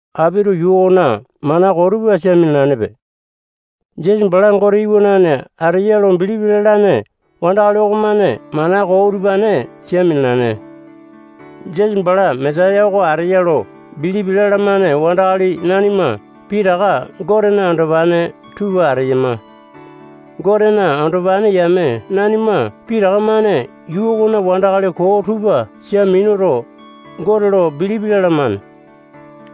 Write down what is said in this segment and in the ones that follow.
Apito yuu okona mana koo tupa sia minalanepe. Jisasa bala Gote iwanane ateya lo bilipi lalane wandakali okomane mana koo utupane sia minalane. Jisasa bala Mesaya oko ateya lo bilipi lalamane wandakali nanima pitaka Gotena andopane tupa ateyama. Gotena andopane yame nanima pitaka-mane yuu okona wandakali koo tupa sia minuto, Gote lo bilipi lalamane.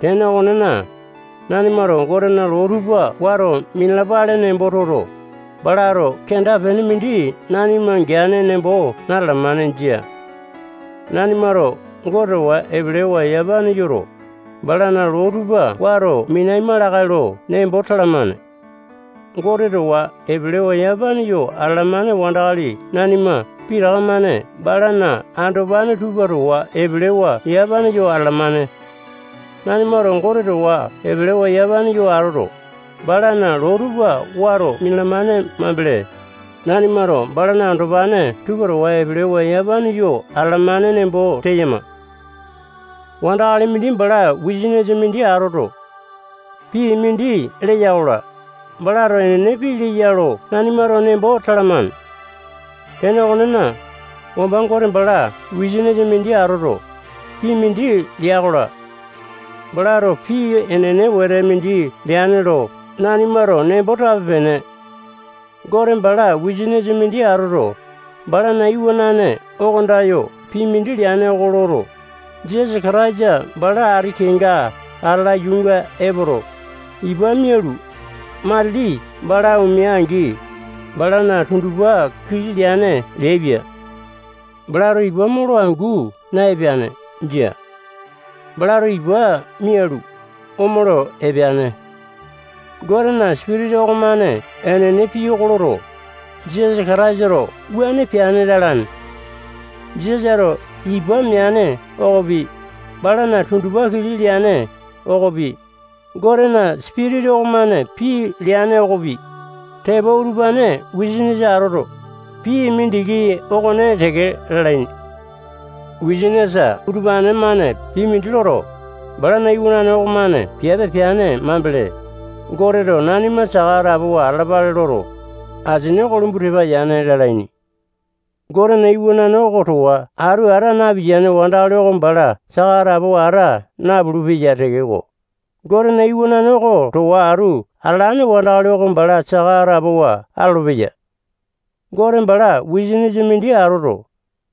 Tene okonena, nanimato Gotena loo tupa wato minalapale nembo toto, balato kenda-pene mindi nanima geane nembo natalamane. Jia. Nanimato Gote towa epelewa yamapane yoto, balana loo tupa wato minaima lakae lo nembo talamane. Gote towa epelewa yamapane yo atalamane wandakali nanima pitaka-mane balana andopane tupa towa epelewa yamapane yo atalamane. Nanimato Gote towa epelewa yamapane yo atoto, balana loo tupa wato minalamane mambele, nanimato balana andopane tupa towa epelewa yamapane yo atalamane nembo teyama. Wandakali mindi bala wisanisa mindi atoto, pii mindi leya-kola, balato enene pii leya lo nanimato nembo talamane. Tene okonena, wamba Gote bala wisanisa mindi atoto, pii mindi lea-kola, balato pii enene wete mindi leane lo nanimato nembo tape-pene. Gote bala wisanisa mindi atoto, balana iwanane oko andayo pii mindi leane oko loto, Jisasa Kataisa bala ati kenga atala yuunga epoto, ipa mialu, matili bala omea-angi, balana tundupa kili leane leaipia. Balato ipa molo angu na-epeane. Jia. Balato ipa mialu, omolo epeane. Gotena Sipitisa okomane enene pii oko loto, Jisasa Kataisato wuane peane lalane. Jisasato ipa meane okopi, balana tundupa kili leane okopi, Gotena Sipitisa okomane pii leane okopi, tepo utupane wisanisa atoto, pii mindiki okone teke lalaini. Wisanisa utupane-mane pii mindi loto, balana iwanane okomane piape peane mambele, Goteto nanima saka atapowa atalapale loto, asini oko lumbu tepa yane lalaini. Gotena Iwanane oko towa atu ata napiyane wandakali oko bala saka atapowa ata napulu-peya tekeko, Gotena Iwanane oko towa atu atalane wandakali oko bala saka atapowa atolopeya. Gote bala wisanisa mindi atoto,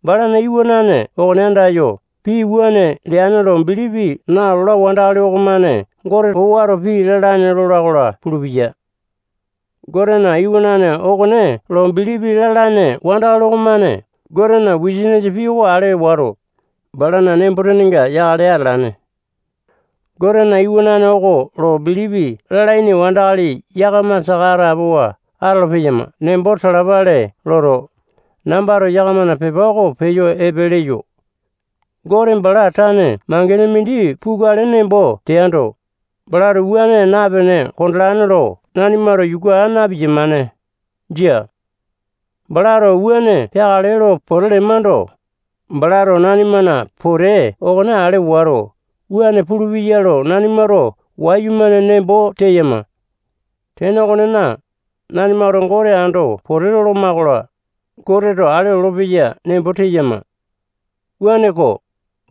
balana Iwanane okone andayo pii wuane leane lo bilipi nalola wandakali okomane Goteto owato pii lalane lola-kola pulupeya. Gotena Iwanane okone lo bilipi lalane wandakali okomane Gotena wisanisa pii oko ale wato, balana nembo-tenenga yakale atalane. Gotena Iwanane oko lo bilipi lalaini wandakali yakama saka atapowa atolo-peyama nembo talapale loto, nambato yakamana pepa oko peyo epe leyo. Gote bala tane mangene mindi pukale nembo teando, balato wuane napene kondolane lo nanimato yuku aa na-piyamane. Jia. Balato wuane peakale lo pote lemando, balato nanimana pote okone ale wato, wuane pulupeya lo nanimato wayumane nembo teyama. Tene okonena, nanimato Gote ando pote loloma-kola, Goteto ale olopeya nembo teyama. Wuaneko,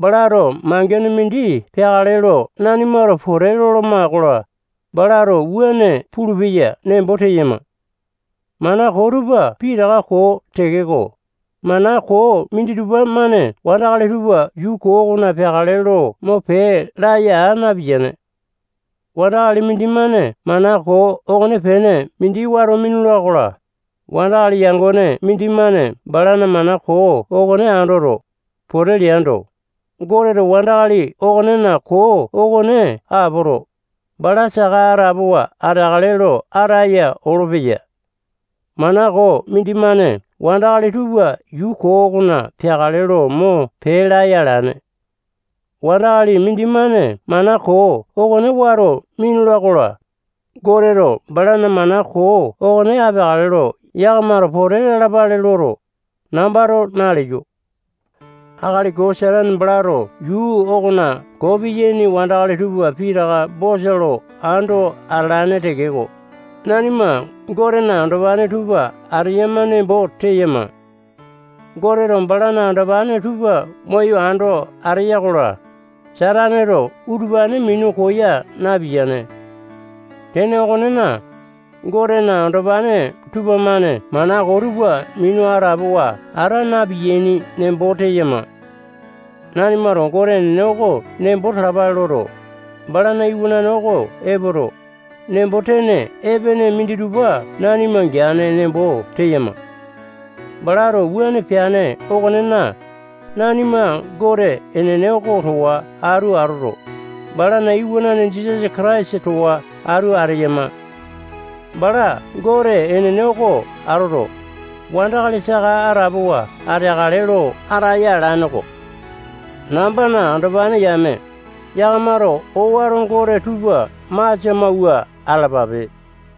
balato mangene mindi peakale lo nanimato pote loloma-kola, balato wuane pulupeya nembo teyama. Mana koo tupa pitaka koo tekeko, mana koo minditupa-mane wandakali tupa yuu koo okona peakale lo mo pee laya aa napiyane. Wandakali mindimane mana koo okonepene mindi wato minula-kola, wandakali yangone mindimane balana mana koo okone andoto, pote leando, Goteto wandakali okonena koo okone apoto, bala saka atapowa ateakale lo ataya olopeya. Mana koo mindimane wandakali tupa yuu koo okona peakale lo mo pee laya alane. Wandakali mindimane mana koo okone wato minula-kola, Goteto balana mana koo okone apeakale lo yakamato pote lalapale loto, nambato naleyo. Akali koo Satane balato yuu okona koo piyaini wandakali tupa pitaka bosa lo ando atalane tekeko, nanima Gotena andopane tupa ateyama nembo teyama. Goteto balana andopane tupa moyo ando ateya-kola, Sataneto utupane minu koya napiyane. Tene okonena, Gotena andopane tupamane mana koo tupa minu atapowa ata na-piyaini nembo teyama. Nanimato Gote enene oko nembo talapale loto, balana Iwanane oko epoto, nembo-tene epene minditupa nanima geane nembo teyama. Balato wuane peane okonena, nanima Gote enene oko towa atu atoto, balana Iwanane Jisasa Kataisa towa atu ateyama. Bala Gote enene oko atoto, wandakali saka atapowa ateakale lo ataya alane-ko. Nambana andopane yame, yakamato owato gote tupa masia mawua atalapape.